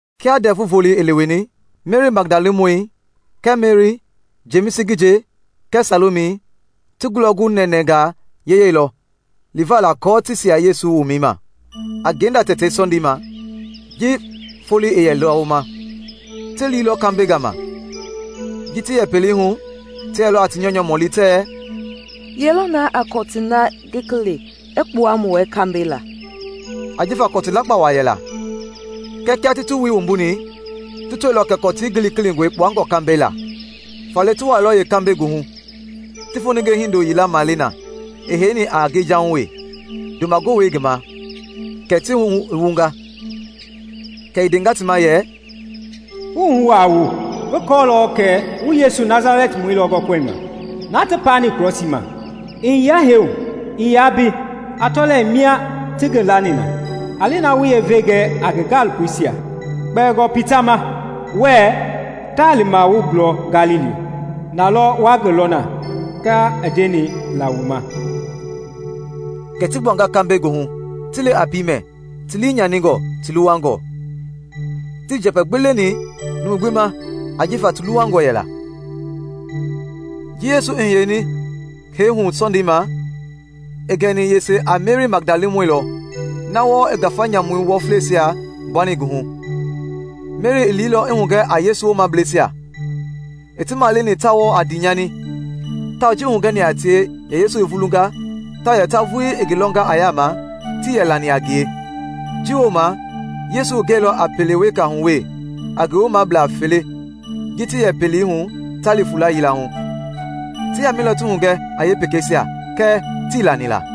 Kia Ndɛvu Volei i leweni, Meri Magdalamɔi kɛɛ Meri, Jemisi ngi nje kɛɛ Salomi ti ngulɔ gu nɛnɛɛngaa yeyɛilɔ liva la aako ti sia Yesu womɛi ma. A ngenda tɛtei Sɔndei ma, ji foloi i yɛ lawoma, ti liilɔ kambɛi gama. Ji ti yɛ pelei hu, ti yɛlɔ a ti nyɔunyɔ mɔli tɛɛ, “Ye lɔ na a kɔtii na gilikili i kpua mu wɛ kambɛi la?” ajifa kɔtu lakpa wa yɛla. Kɛɛ kia ti ti wui wumbuni, ti tɔilɔ kɛ kɔtii gilikilingɔi kpuangɔ kambɛi la. Faale ti wuailɔ yeekambɛi goohu, ti foninge hindo yila male na i heini a ngejahui wee, ndoma gowei i ngi ma, kɛ ti wuhu i wunga. Kɛ i ndenga ti ma yɛ, “Wu wuhu aa wu, ngi kɔɔlɔ kɛ wu Yesu Nasalɛtimɔi lɔ gɔkɔlima, na ti kpakpani krɔsii ma. I hiyenga hee hu, ii yaa mbe. A tɔlɛ, mbe mia ti ngi lani na. A li na wu yeevei ji gɛ a ngi gaalopoisia, kpɛɛngɔ Pita ma, wɛɛ, ‘Ta lima wu gulɔ Galili; na lɔ wa ngi lɔ na, kia i ndeni la wu ma.’” Kɛ ti gbuanga kambɛi goohu, ti li a piimɛ, ti lii nyaningɔ, ti luwangɔ. Tii njɛpɛ gbi leni numu gbi ma ajifa ti luwangɔ yɛla. [ Ji Yesu i hiyeni hee hu Sɔndei ma, i gɛni yese a Meri Magdalamɔi lɔ, na wɔɔ i ngafa nyamu wɔfleisia gbuani ngi hu. Meri i liilɔ i hugɛ a Yesu woomableisia. I ti maleni ta wɔɔ a ndiinyani; tawao ji i hugɛni a tie yɛ Yesu i vulunga tawao yɛ ta vulii i ngi lɔnga a yaama, tii lani a ngie. Ji wooma Yesu i gɛilɔ a pele weka hu wee a ngi woomablaa fele ji ti yɛ pelei hu ta li fuula yila hu. Ti yamɛilɔ ti hugɛ a yeepekeisia kɛɛ tii lani la.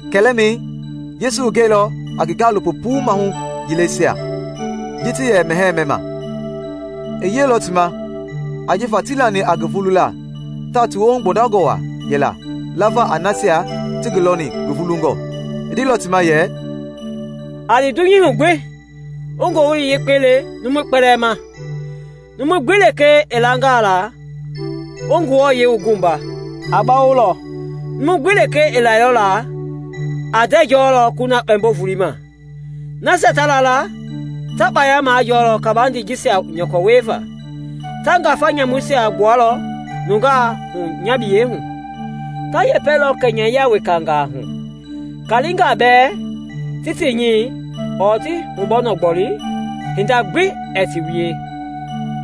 Kɛlɛmɛi, Yesu i gɛilɔ a ngi gaalopo puu maahu yileisia ji ti yɛ mɛhɛɛ mɛma. I yiɛilɔ ti ma ajifa tii lani a ngi vulula tawao ti woohu gbɔndangɔ wa yɛla lava a nasia ti ngi lɔni ngi vulungɔ. I ndeilɔ ti ma yɛ, “A li dunyei hu gbi wu Ngowili Yekpei le numui kpɛlɛɛ ma. Numu gbi lekee i langaa la, wu ngi wua, a bawolɔ; numu gbi lekee ii lɛilɔ la, a ndɛɛ jɔlɔ kuna kpɛmbo-volei ma. Nasia ta la la ta kpaya majɔɔlɔ kabandei jisia nyɔkɔ wieva: ta ngafa nyamuisia gbualɔ nungaa hu nya biyei hu; ta yɛpɛlɔ kɛnyɛyia wekangaa hu; kalingaa bɛɛ ti ti nyi ɔɔ ti hubɔnɔ gboli, hinda gbi ɛɛ ti wie;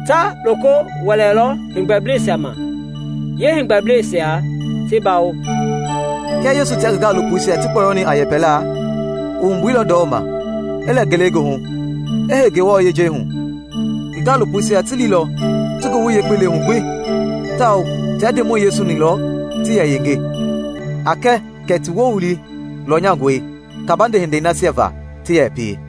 ta loko wɛlɛlɔ heegbɛbla ma, yeeheegbɛbla ti bawo.” Kia Yesu tia ngi gaalopoisia ti kpɔyɔni a yɛpɛla, i wumbuilɔ ndɔma, i lɛ ngelegoohu, i hei Ngewɔ yejei hu. Ngi gaalopoisia ti liilɔ ti Ngowili Yekpei le hu gbi tawao tia Ndemɔi Yesu-ni lɔ ti yɛ yenge, a kɛ kɛ ti Wowili lɔnyangɔe kabande hindei nasia va ti yɛ pie.]